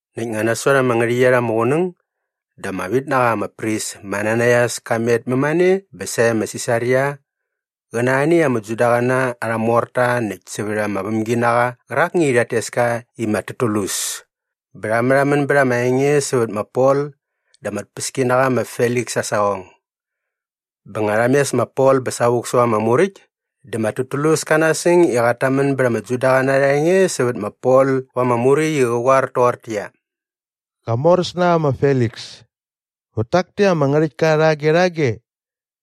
Näkt nga nasot ama ngärhäqyet ama qunäng dä ama vit na qa ama pris ma Ananaias ka met mämane bä sae ma Sisaria qä na arhani ama Judaqäna arha morta näkt sävät arha vämginaqa qärakni i rhat tes ka i ma Tertulus bä rha märhamän bät arha enge sävät ma Pol da ama tpäskinaqa ma Feliks aa saqong. Bä nga rha mes ma Pol bä savuk säva ama muräkt dä ma Tertulus kä nasäng i qat tamän bät ama Judaqäna arha enge sävät ma Pol va ama muräkt i qä qoar toqortäqyia, “Qamoräsnaqa ma Feliks, vät tak täkt ama ngärhäktka rhage rhage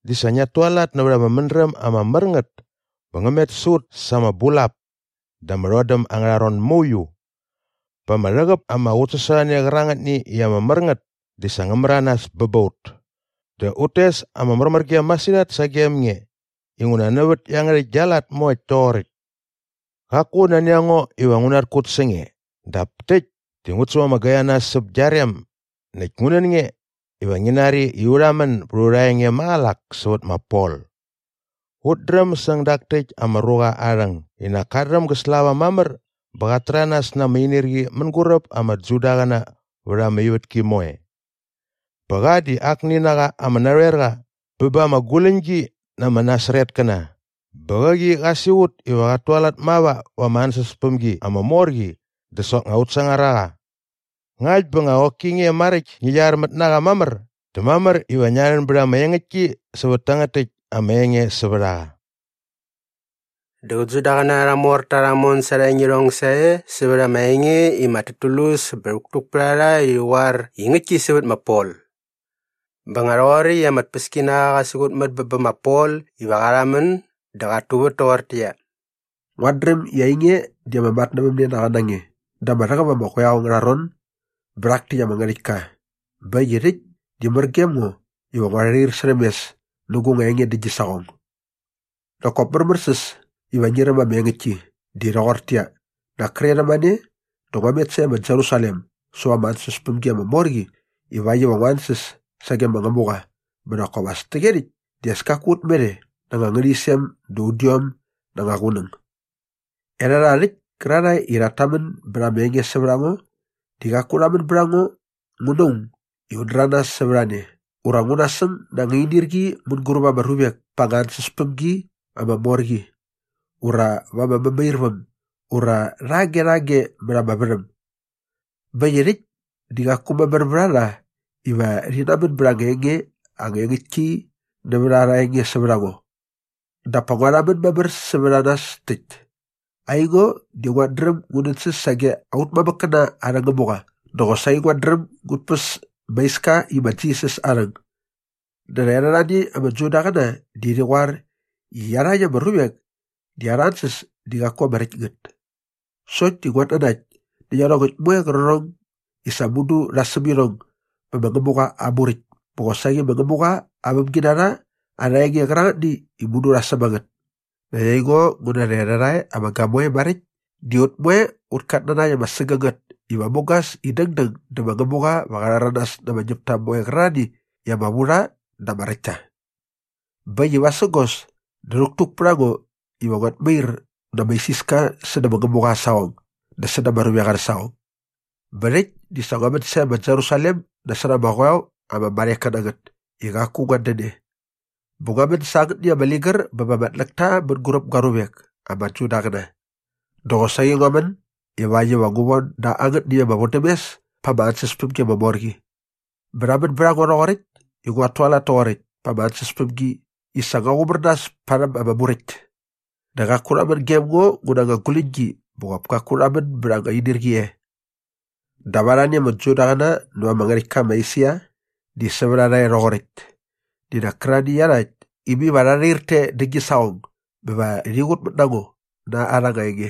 di sa ngiat tualat nävät ama mädräm ama mär ngät bä ngä met sä ut sa ama bulap da ama rhodäm angärha ron mauiu. Bä ama rhäqäp ama qutsasorhane qärangätni i ama mär ngät di sa ngä märanas bä bä ut. Dä ut tes ama märmärgem masirhat sagem nge inguna nävät iangärhäkt gia lat moekt toqoräkt. Qaku nani a ngo iva ngu natkut sä nge dap täkt di ngut säm ama gaini na nas säp gia rem näkt ngu nän nge iva ngi nari i u rhamän bät aurha enge maqälak sävät ma Pol. “Ut dräm säng dak täkt ama ruqa aa rhäng i nak kat dräm gä slava mamär bä qat täranas na ama inirqi mänguräp ama Judaqäna vät ama ivätki moe. Bä qa di akni na qa ama narhoerqa bä ba ama guläñgi na ama Nasaretkäna bä qäqi qa siqut iva qat tualat mava va ama ansäspämgi ama mor qi dä soknga ut sangar a qa. Ngakt bä nga qoki nge maräkt ngi qyarmät na qa mamär dä mamär iva ngia rhän bät ama engäktki sävät tangät täkt ama enge sävät a qa.” Dä qä Judaqäna arha morta rha mon sa arha engirhong sae sävät ama enge i ma Tertulus bä rhäktuk pät a rha i rhi qoar i ngäktki sävät ma Pol. Bä nga rhoqoräkt i ama tpäskinaqa qa siqutmät bä bä ma Pol iva qa rhamän dä qat tuvät toqortäqyia, “Nguat dräm i ainge di ama matnävämnenaqa na nge da ama rhäqäp ama qoeo angärha ron bä rhak täkt ama ngärhäktka bä äkt i rhäkt di mär gem ngo iva ngua rhair särhäm mes nä gu nga enge dä gi saqong. “Nak kop märmärsäs iva ngi räm ama engäktki di rhoqortäqyia, nak kre rhämane dä ngua met sae ma Jerusalem säva ama ansäspämgi ama mor qi ivakt iva ngu ansäs sage ma Ngämuqa bä nak kop as täqyerhäkt di as kaku ut met e na anga ngärhäqyisem da udiom na anga qunäng. Erhärha rhäkt kärarhae i rhat tamän bät ama enge sävät a ngo di qaku rha män bät a ngo ngu na aung i un däranas sävät a ne ura ngu nasäng na anga inirqi mänguräp ama ruvek pa ama ansäspämgi ama mor qi ura va ama mämairväm ura rhage rhage mät ama värhäm. Bä äkt i rhäkt di qaku mamär vät a rha iva rhi namän bät anga engäktki nävät arha enge sävät a ngo. “Dap pa ngua rhamän mamär sävät a nas täkt. Aingo di nguat dräm ngu nänsäs sage aut mamäkkäna arhä Ngämuqa dä qosaqi nguat dräm ngut päs ma Iska i ma Jisas aa rhäng. Dä rhaerhärhani ama Judaqäna di rhi qoar i iarhakt ama ruvek di arha ansäs di qaku ama räkt ngät. Sokt di nguat nanakt nä iarhongäkt moe qärqärhong i sa mudu rha säm irhong bä ma Ngämuqa aa Muräkt bä qosaqi ma Ngämuqa aa vämginarha arha enge qärangätni i mudu rha säm a ngät. Näkt aingo ngu na rhaerhärhae ama gamoe maräkt di ut moe ut katnanakt ama sägängät iva mugas i dängdäng dä ma Ngämuqa va qa rhäranas na ama ñäpta moe qärarhani i ama vu rha dä ama räkt ta. Bä äkt i vasägos dä rhäktuk pät a ngo iva nguat mair na ama isiska sädä ma Ngämuqa aa saqong dä säda ama ruvek arhä saqong. “Bä rhäkt di sa ngua män sae ma Jerusalem nasot ama qoeo ama marheka na ngät i qaku nguat dän e. Bä ngua män sa angätni ama ligär bä ba ama tläkta mänguräp gua ruvek ama Judaqäna. Dä qosaqi ngua män ivakt iva ngu von da angätni ama vodämes pa ama ansäspämgi ama mor qi. Bä rha män bät a ngo rhoqoräkt i nguat tualat toqoräkt pa ama ansäspämgi i sa ngua qumär nas parhäm ama Muräkt. Dä qaku rha män gem ngo ngu na anga guläñgi bä qop kaku rha män bät anga inirqi e. “Dap arhani ama Judaqäna näva ama ngärhäktka ma Esia di sävät a rha e rhoqoräkt di nak kärarhani iarhakt i mai va rha rhair te dä gi saqong bä va rhi qut mä ngo na arha anga enge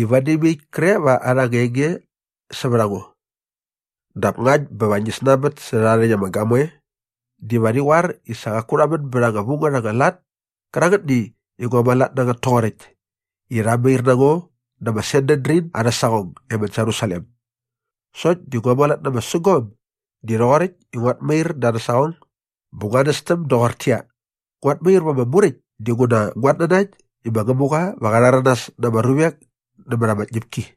i vadi mai äkt kre va arha anga enge sävät a ngo. Dap ngakt bä va ngi snanbät sä rhärha rhäkt ama gamoe diva rhi qoar i sa qaku rha män bät anga vu ngät anga lat kärangätni i ngua mualat nä ngät toqoräkt i rha mair na ngo dä ma Sanedrin arhä saqong e ma Jerusalem. Sokt di ngua mualat na ama sägom di rhoqoräkt i nguat mair da arhä saqong bä ngua nästäm doqortäqyia, ‘Nguat mair va ama muräkt dinguna nguat nanakt i ma Ngämuqa va qa rhäranas na ama ruvek nämät ama tñäpki.’”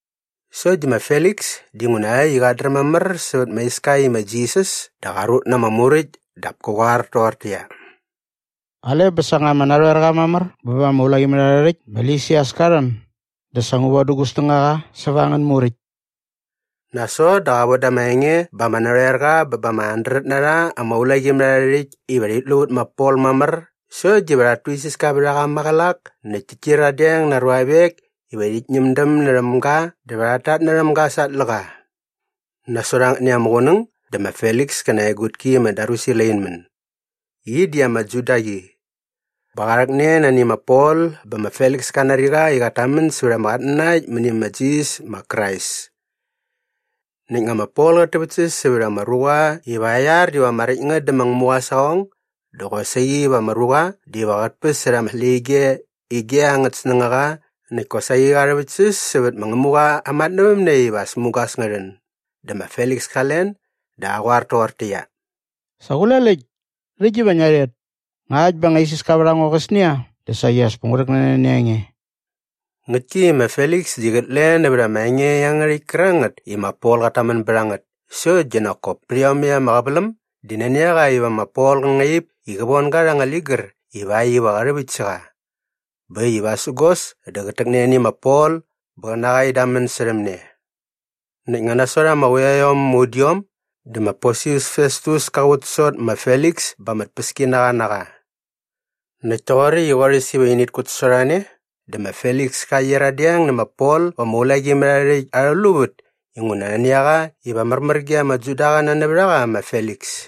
Sokt di ma Feliks dinguna äkt i qat dräm mamär sävät ma Iska i ma Jisas dä qa rut na ama muräkt dap kä qoar toqortäqyia, “Qale bä sa nga ama narhoerqa mamär bä ba ama ulaqimärharhärhäkt ma Lisias ka rhän dä sa ngu vodä gu nga snängaqa säva angän muräkt.” Nasot dä qa voda ama enge ba ama narhoerqa bä ba ama handret na rha ama ulaqimärharhärhäkt iva rhit lu vät ma Pol mamär sokt diva rhat tuisiska vät a qa maqälak näkt tit kyiradeng na aa ruavek iva rhit ñämdäm närhäm ga dä va rhat tatnärhäm ga sa aa tläqa. Nasot angätni ama qunäng dä ma Feliks kä na aa egutki ma Drusila in män. Qi di ama Judaqi. Bä qa rhäkne nani ma Pol bä ma Feliks ka nari qa i qat tamän sävät ama qatnanakt mäni ma Jisas ma Krais. Näkt nga ma Pol qät täväktsäs sävät ama ruqa iva aa iar diva ama räkt ngät dä ma Ngämuqa aa saqong dä qosaqi va ama ruqa diva qät päsärha ama släqyige ige angät snängaqa näkt kosaqi qa rhäväktsäs sävät ma Ngämuqa aa matnävämne iva as mugas ngä rhän dä ma Feliks ka len dä qa qoar toqortäqyia, “Sa qule läkt! Rhäkt diva ngia rhet. Ngakt bä nga isiska vät a ngo qäsnia dä saqi as pa ngu rhäkne nani a nge.” Ngäktki i ma Feliks di qät len nävät ama enge iangärhäkt kärangät i ma Pol qat tamän bät a ngät sokt di nak kop pät iomäkt ama qäväläm di nani a qa iva ma Pol qä ngaip i qä von ga rha anga ligär ivakt iva qä rhäväkt sä qa. Bä äkt i vasägos dä qät täkne nani ma Pol bä qä na qa in damän särhäm ne. Näkt nga nasot ama quiaiom ama udiom dä ma Porsius Festus ka qutsasot ma Feliks bä ama tpäskinaqa na qa. Näkt toqoräkt i qorhäs iva init kutsasorhane dä ma Feliks ka qyiradeng nä ma Pol va ama ulaqimärharhärhäkt arhä luvät inguna nani a qa iva märmär ge ama Judaqäna nävät a qa ma Feliks.